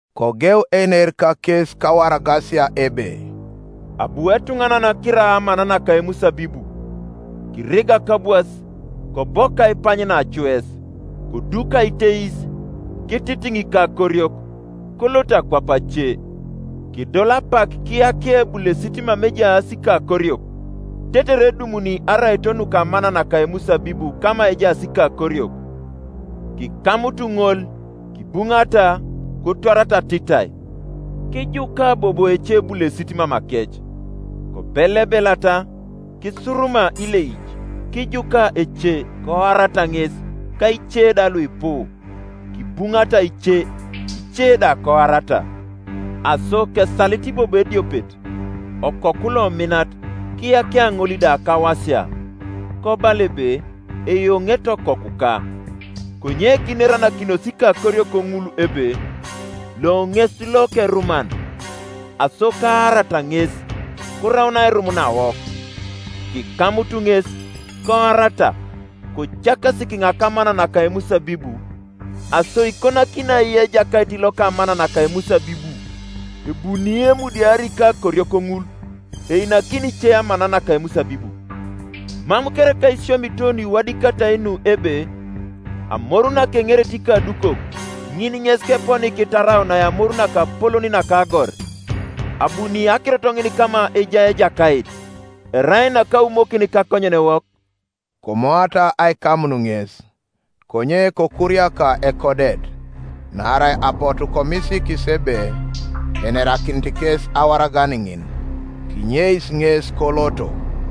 Kogeu einer kakes kawaragasia ebe, “Abu etuŋanan kira amana naka emusabibu, kirigak abwas, kobok aipany nacues, koduk aiteis, kititiŋ ikakoriok, kolot akwap ace. Kedol apak kiyakia ebulesit mama ejaas ikakoriok, tetere edumuni araito nuka amana naka emusabibu kama ejaas ikakoriok. Kikamut ŋol, kibuŋata, kotwarata atitai. Kijuka bobo ecebulesit mamakec; kobelebelata, kisuruma ileic, Kijuka ece; koarata ŋes: ka ice da luipu; kibuŋata ice, ice da koarata. Aso kesalit bobo ediopet, okoku lominat: kiyakia ŋol da kawasia, kobala ebe, ‘Eyoŋete okokuka.’ Konye kineranakinos ikakoriok ŋul ebe, ‘Lo ŋes lokeruman; aso kaarata ŋes, koraun airum nawok.’ Kikamut ŋes, koarata, kocakasi kiŋa kamana naka emusabibu. Aso ikonakini ai ejakait loka amana naka emusabibu? Ebuni emudiari ikakoriok ŋul, einakini ice amana naka emusabibu. Mam kereka isiomito nuiwadikatai nu ebe, ‘Amoru nakeŋerete ikadukok, Ŋin ŋes keponi kitaraunai amor nakapolon naka agor: Abuni akirot ŋin kama ejai Ejakait, Erai nakaumokin kakonyenewok’?” Komoata aikamun ŋes; konye kokuriaka ekodet; naarai apotu komisiikis ebe enerakinit kes awaragan ŋin: kinyeis ŋes koloto.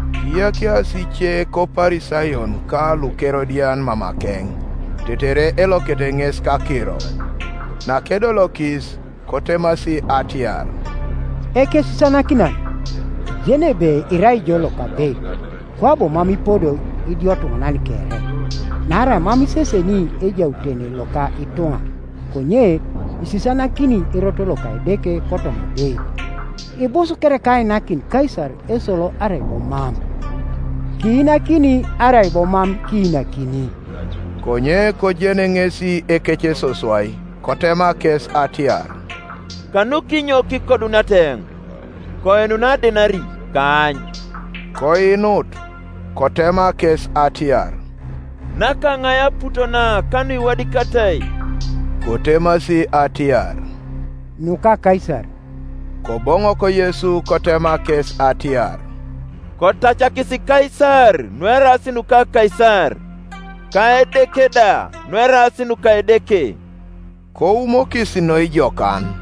Kiyakiasi ice koParisayon ka luKerodian mamakeŋ, tetere elokete ŋes kakiro. Nakedolokis, kotemasi atiar, “Ekesisianakinan, kijeni ebe irai ijo lokabeit, kwabo mam ipodo idiotuŋanan kere: naarai mam iseseni ejautene loka ituŋa, konye isisianakini erot loka Edeke kotoma abeit. Ibus kereka ainakin Kaisar esolo arai bo mam? Kiinakini, arai bo mam kiinakini?” Konye kojen ŋesi ekecesoswai, kotema kes atiar, “Kanukinyo kikoduniata eoŋ? Koinunai adenari, kaany.” Koinut. Kotema kes atiar, “Nakaŋai aput na ka nukiwadikatai?” Kotemasi atiar, “Nuka Kaisar.” Koboŋok Yesu kotema kes atiar, “Kotacakis Kaisar nueraas nuka Kaisar, ka Edeke da nueraas nuka Edeke.” Koumokis noi jokan.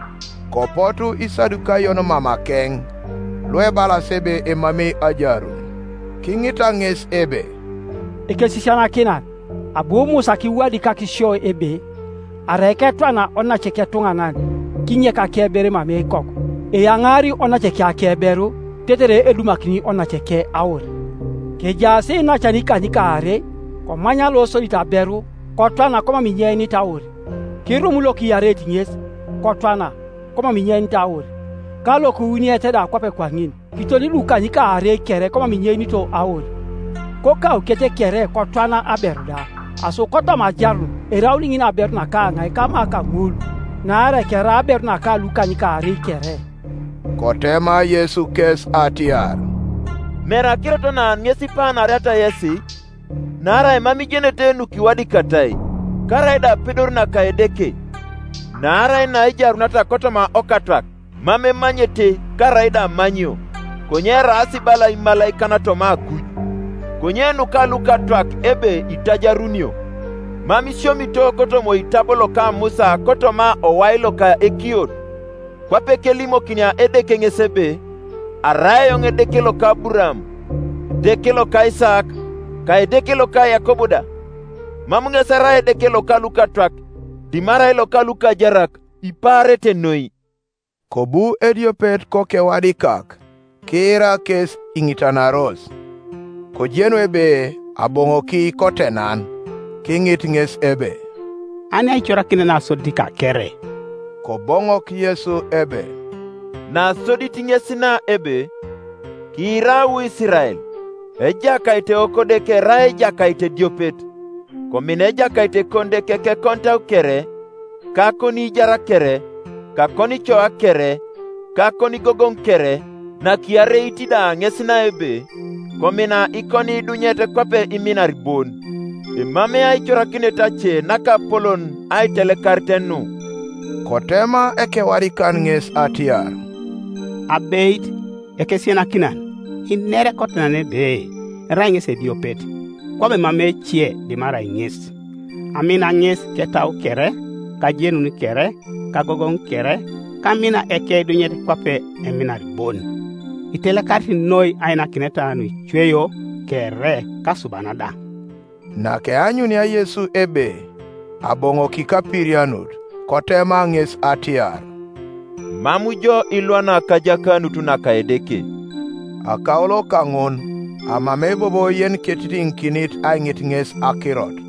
Kopotu Isadukayon mamakeŋ, luebalas ebe emamei ajarun; kiŋita ŋes ebe, “Ekesisianakinan, abu Musa kiwadikak sio ebe, Arai ketwana onace ketuŋanan, kinyek akeberu emamei ikoku, eyaŋaari onaceke akeberu, tetere edumakini onaceke aur. Kejaas iinacan ikanykaarei: komany losodit aberu, kotwana komam inyeinit aur; Kirum lokiareit ŋes, kotwana, komam inyeinit aur; ka lokiwuniet da kwape kwaŋin. Kiton lukanykaarei kere komam inyeinito aur. Kokaukec kere kotwana aberu da. Aso kotoma ajarun eraun ŋin aberu nakaŋai kama kaŋul? Naarai kerai aberu naka lukany kaarei kere.” Kotema Yesu kes atiar, “Mere akirot na ŋes ipaanariata yesi? Naarai mam ijenete nukiwadikatai, karaida apedor naka Edeke. Naarai naejaruniata kotoma okatwak, mam emanyete, karaida amanyio: konye eraas bala imalaikan toma akui. Konye nuka lukatwak ebe itajarunio; mam isiomito kotoma oitabo loka Musa kotoma owai loka Ekiot, kwape kelimokinia Edeke ŋes ebe, ‘Arai eoŋ Edeke loka Aburaam, Edeke loka Isaak, ka Edeke loka Yakob da’? Mam ŋes erai Edeke loka lukatwak, dimarai loka lukajarak; ipaarete noi.” Kobu ediopet kokewadikak, kiira kes iŋitanaros, kojenu ebe aboŋoki kotenan, kiŋit ŋes ebe, “Ani aicorakinet nasodit kakere?” Koboŋok Yesu ebe, “Nasodit ŋes na ebe, ‘Kiira wu Isirael; Ejakait Ewokodeke, erai Ejakait ediopet. Komina Ejakait Ekonideke kekonitau kere, ka akoniijar kere, ka akonicoa kere, ka akonigogoŋ kere.’ Nakiareit da ŋes na ebe, ‘Komina ikoniidunyet kwape iminar bon.’ Emamei aicorakinet ace nakapolon aitelekarit nu.” Kotema ekewadikan ŋes atiar, “Abeit, Ekesisianakinan, iner kotenan ebe erai ŋesi ediopet; kwabo emamei ece dimarai ŋes. Amina ŋes ketau kere, ka ajenun kere, ka agogoŋ kere, ka amina ikeidunyet kwape eminar bon, itelekarit noi ainakineta nuicweio kere ka asuban da.” Nakeanyunia Yesu ebe aboŋoki kapirianut, kotema ŋes atiar, “Mam jo ilwana kajakanut naka Edeke.” Akaulo kaŋun amamei bobo yeniketitiŋikinit aiŋit ŋes akirot.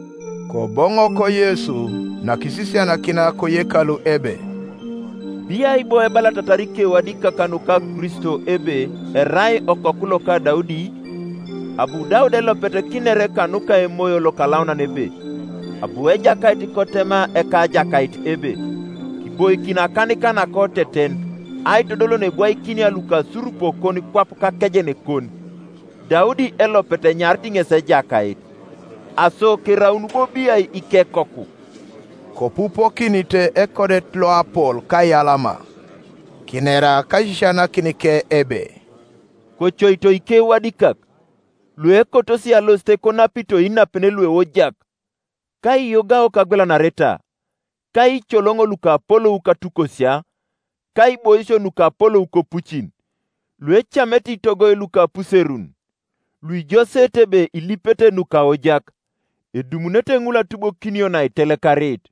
Koboŋok Yesu, nakisisianakinia koyekalu, ebe, “Biai bo ebalatatar ikewadikak nuka Kristo ebe erai okoku loka Daudi? Abu Daudi elopet kiner kanuka Emoyo Lokalaunan ebe, ‘Abu Ejakait kotema Ekajakait ebe, Kiboikin akanika nakoteten, Aitodol neebwaikinia lukasurupokon kwap kakejenekon.’ Daudi elopet enyarit ŋes Ejakait; aso keraun bo biai ikekoku?” Kopupokinite ekodet loapol kaiyalama. Kinera kaisisianakinike ebe, “Kocoito ikewadikak, luekotosi alosit konapito inapen lueojak, ka aiyogao kagwelanareta, ka iicoloŋo lukapolou katukosia, ka aiboisio nukapolou kopucin. Luecamete itogoi luka apuserun, luijoseete ebe ilipete nukaojak; edumunete ŋul atubokinio naitelekarit.”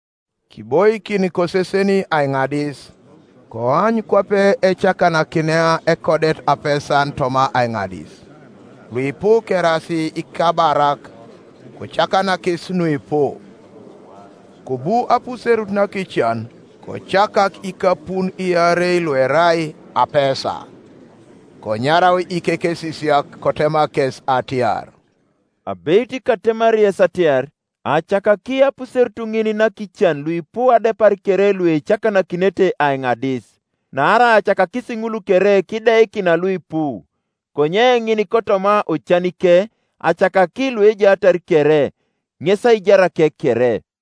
Kiboikin koseseni aiŋadis, koany kwape ecakanakinia ekodet apesan toma aiŋadis; luipu keraas ikabarak kocakanakis nuipu. Kobu apuserut nakican kocakak ikapun iarei luerai apesa. Konyarau ikekesisiak, kotema kes atiar, “Abeit katemari yes atiar, acakaki apuserut ŋin nakican luipu adepar kere luecakanakinete aiŋadis. Naarai acakakis ŋul kere kideikina luipu; konye ŋin kotoma ocanike acakaki lukejaatar kere, ŋes aijarake kere.”